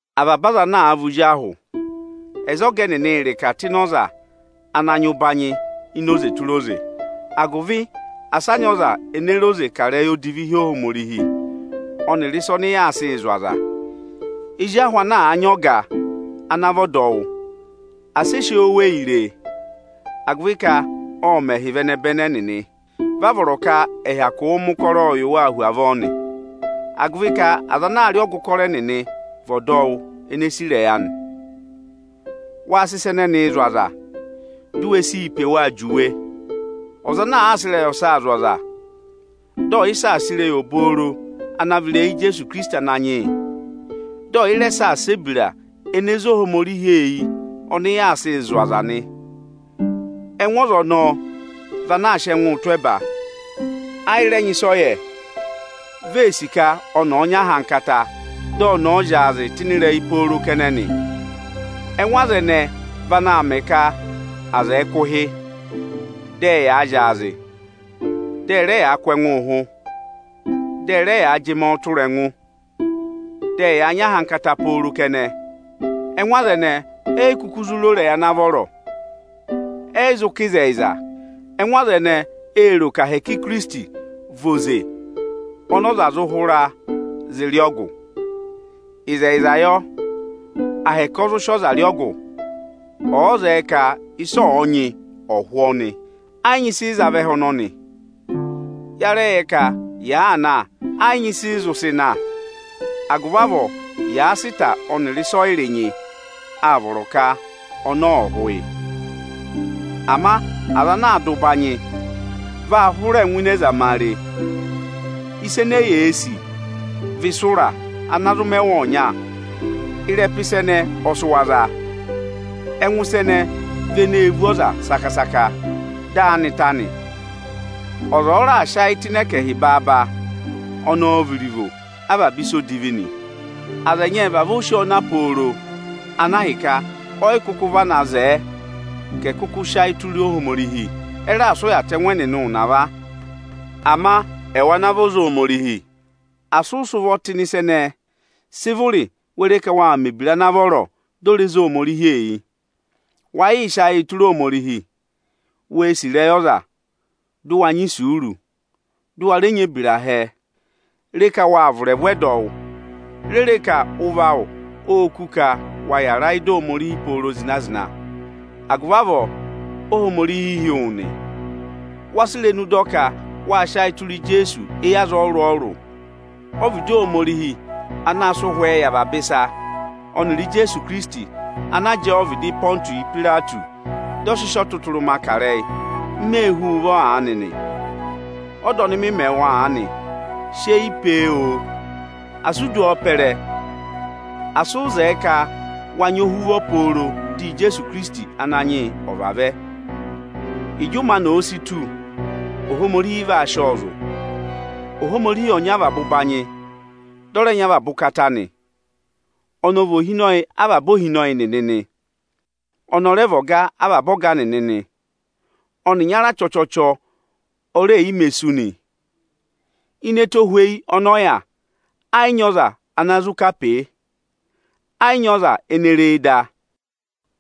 Avaba aza ana àa vị ozi ahụ, ẹ̀ za ọga ẹnịnị ịrịka tụ́ ịnị ọza ana nyị ụbanyị ini oze tụra oze, agụvị asị a nyị ọza ene re oze kà ịrẹyị odivi hi Ohomorihi ọnịrị ịsa ọnị yaa sịị zụ̀ aza! Ezi ahụ ana àa nyị ọga ana vị ọdọwụ, asị ẹ sị eyi oweyi ree, agụvị ka ọ́ọ mẹhị vị ẹnẹbẹnị ẹnịnị. Vị a vọrọ ka ẹ̀ hyakụụ mẹ ụkọrọọ yị waa hu avọọ nị, agụvị ka aza ana aa rị ọgụ ụkọrọ ẹnịnị vị ọdọwụ ene e sì ịrẹyị anị. Ịrẹyị ireche ọnịrị ụbanyị obooro Waa sị ịsa ẹnẹnịị zụ̀ aza, di u we sii pe waa juwe! Ọza ana àa sị ịrẹyị ọsa zụ̀ aza, dị ọ̀yị saasa ịrẹyị obooro ana vị ịrẹyị Ijeesu Ikirisiti Ananyị yị, dị ọ̀yị rẹ saasa ebira ene zé Ohomorihi eyi ọnị yaa sịị zụ̀ aza nị, ẹngụ ọza ọnọọ vị ana aa sị ẹngụụ tụ́ ẹba, ayị rẹ nyị ịsị ọ yẹ. Ve ee sì ka ọnị ọ̀ọ nyị ahankata, dị ọnị ọ̀ọ zyaazịị tụ́ ịnị ịrẹyị pooro kẹnẹ nị. Ẹngụ aza ẹnẹẹ vị anaā mẹ ka aza ẹ̀ẹ kụ̀ ụhị, dị ẹyaa zyaazị, dị ẹ rẹ yaa kụ̀ ẹngụ ụhụ, dị ẹ rẹ yaa jị mọọ tụra ẹngụ, dị ẹyaa nyị ahankata pooro kẹnẹ. Ẹngụ aza ẹnẹẹ, eyi kuku zụ ro ịrẹyị ana vọrọ, ẹyị zụ kà ịzẹyịza. Ẹngụ aza ẹnẹẹ ee ro ka ahẹkẹ Ikirisiti vị oze ọnị ọza zụ hụra zị rị ọgụ. Ịzẹyịza yọ, ahẹkẹ ọ zụ sị ọza rị ọgụ, ọ̀ọ zẹẹ ka ịsị ọnị ọ̀ọ nyị, ọ̀ hụ ọnị. Ẹ yị nyị ịsị ị za vẹ ẹhẹ ọnọnị. Ya rẹ yẹ ka yàaa na, ẹ yị nyị ịsị ị zụ sị na. Agụvị avọọ, yàa sị ịta ọnịrị ịsọyịrị nyị, áa vọrọ ka ọnọọ ọ̀ hụ yị. Ama aza ana aa dụ ụbanyị vaa hụrẹ ngụ ịnị ẹzamare. Ịsa ene eyee sì, vị ịsa ụra ana zụ mẹ wa ọnya; ịrẹpa ịsa ẹnẹẹ ọ sị wa za. Ẹngụ ịsa ẹnẹẹ vị eneē vú ọza saka-saka, dị áanị ta nị. Ọza ọ̀ọ raà sị ayị tụ́ ịnị ẹkẹhị baaba, ọnị ọọ̄ vị iruvo avaba ịsa odivi nị. Aza ẹnyị ẹ́ẹ vavọọ sì ọọ na pooro, ana ahịka ọyị kụkụ vana zẹẹ ka ẹ̀ kụkụ sị ayị tụra Ohomorihi; ẹ raà sị ụya tụ̀ ẹngụ ẹnịnị ụnava. Ama ẹwụ ana vị ọza Ohomorihi, asị ụ sị ụvọ tụ́ ịnị ịsa ẹnẹẹ! Sị vụrị we re ka waa mẹ̀ ebira ana vọrọ, dị o re zé Ohomorihi eyi! Wa yịị sị ayịị tụra Ohomorihi! Wee sì ịrẹyị ọza, dụ wa nyị isuuru, dụ wa rẹ nyị ebira hẹẹ! Re ka waa vụ̀ ịrẹvụ ẹdọwụ! Re re ka ụvọ awụ óo kú ka wa yàra ị́da Ohomorihi pooro zịna-zịna! Agụvị avọọ Óhomorihi hị́ wụ nị. Wáa sị irenu dọ ka wáa sị ayị tụra Ijeesu éyi aza ọrụrụ-ọrụrụ. Ọ́vịdị Ohomorihi anaā sịị Ụhwẹẹ yị avaba ịsa, ọnịrị Ijeesu Ikirisiti ana jẹẹ ọvịdị Ịpọntụsị Ipayireti, dị ọ sị sị ọtụtụrụma kà ịrẹyị, m mee hú wu ụvọ aanị nị. Ọda ọnị mị mẹ wụ aanị, sị eyi pee, oo! Asị u du ọọ pẹrẹ, asị ụ zẹẹ ka wa nyị ohuvọ pooro dị Ijeesu Ikirisiti Ananyị yị ọ̀ vavẹ! Ịjị ụmẹ anị òo si tù, Ohomorihi vaa sị ọọ zụ̀. Ohomorihi ọ nyị avaba ụbanyị, dị ọ rẹ nyị avaba ụkata nị. Ọnị ọ vị Ohinọyị avaba ohinọyị nịnị nị; ọnị ọ rẹ vị Ọga avaba ọga nịnị nị. Ọnị ịnyara chọchọchọ o reè yi mē sú nị. Ini ẹtohweyi ọnị ọ yà, ẹ yị nyị ọza ana zụ kà pee. Ẹ yị nyị ọza ene ree da,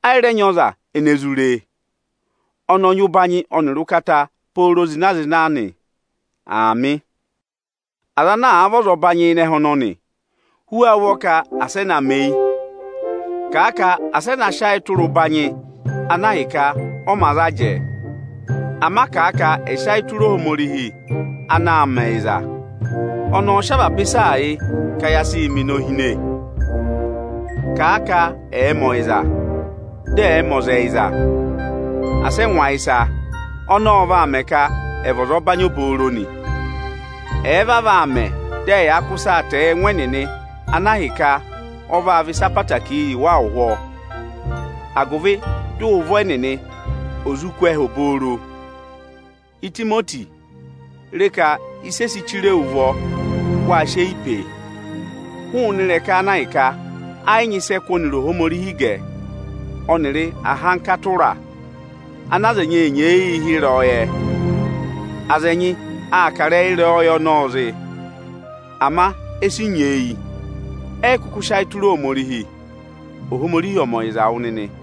ayị rẹ nyị ọza ene zụ ree. Ọnị ọ nyị ụbanyị ọnịrị ụkata pooro zịna-zịna nị. Aamị. Aza ana vị ọzọbanyị ịnị ẹhẹ ọnọnị, hú wa ụvọ ka asị ẹ na mẹ eyi! Kàa ka asị ẹ na sị eyi tụra ụbanyị ana ahịka ọ mā za jẹẹ! Ama kà a ka ẹ̀ sị ayị tụra Ohomorihi anaā mẹ ẹyịza! Ọnị ọọ̄ sị avaba ịsaa yị ka ya sịị mẹ inohine. Kàa ka ẹ̀ẹ mẹ ọyịza, dị ẹ̀ẹ mẹ ọza ẹyịza, asị ẹ ngụ ayịsa! Ọnọọ ọ vaa mẹ ka ẹ̀ vị ọzọbanyị obooro nị. Ẹ̀ẹ vavọọ aa mẹ, dị ẹyaa kụ́ ịsaa tẹẹ yị ẹngụ ẹnịnị ana ahịka ọ vaa vị ịsa ẹtẹẹtẹrẹ yị wa ụhwọọ, agụvị dị ụvọ ẹnịnị ò zụ kú ẹhẹ obooro. Itimoti, re ka ịsị e si chire wu ụvọ, wáa sị eyi pee! Hụụnị ịrẹka ana ahịka ẹ yị nyị ịsị ẹ kụ́ ọnịrị Ohomorihi gẹ, ọnịrị ahankata ụra ana aza ẹnyị ee nyeeyii hị́ “ịrẹyọyẹ”. Aza ẹnyị aa kà ịrẹyị “ịrẹyọyẹ” ọnọọ zị, ama e si nyeeyi, ẹyị kụkụ sị ayị tụra Ohomorihi. Ohomorihi ọ̀ mẹ ọyịza yị wụ nịnị!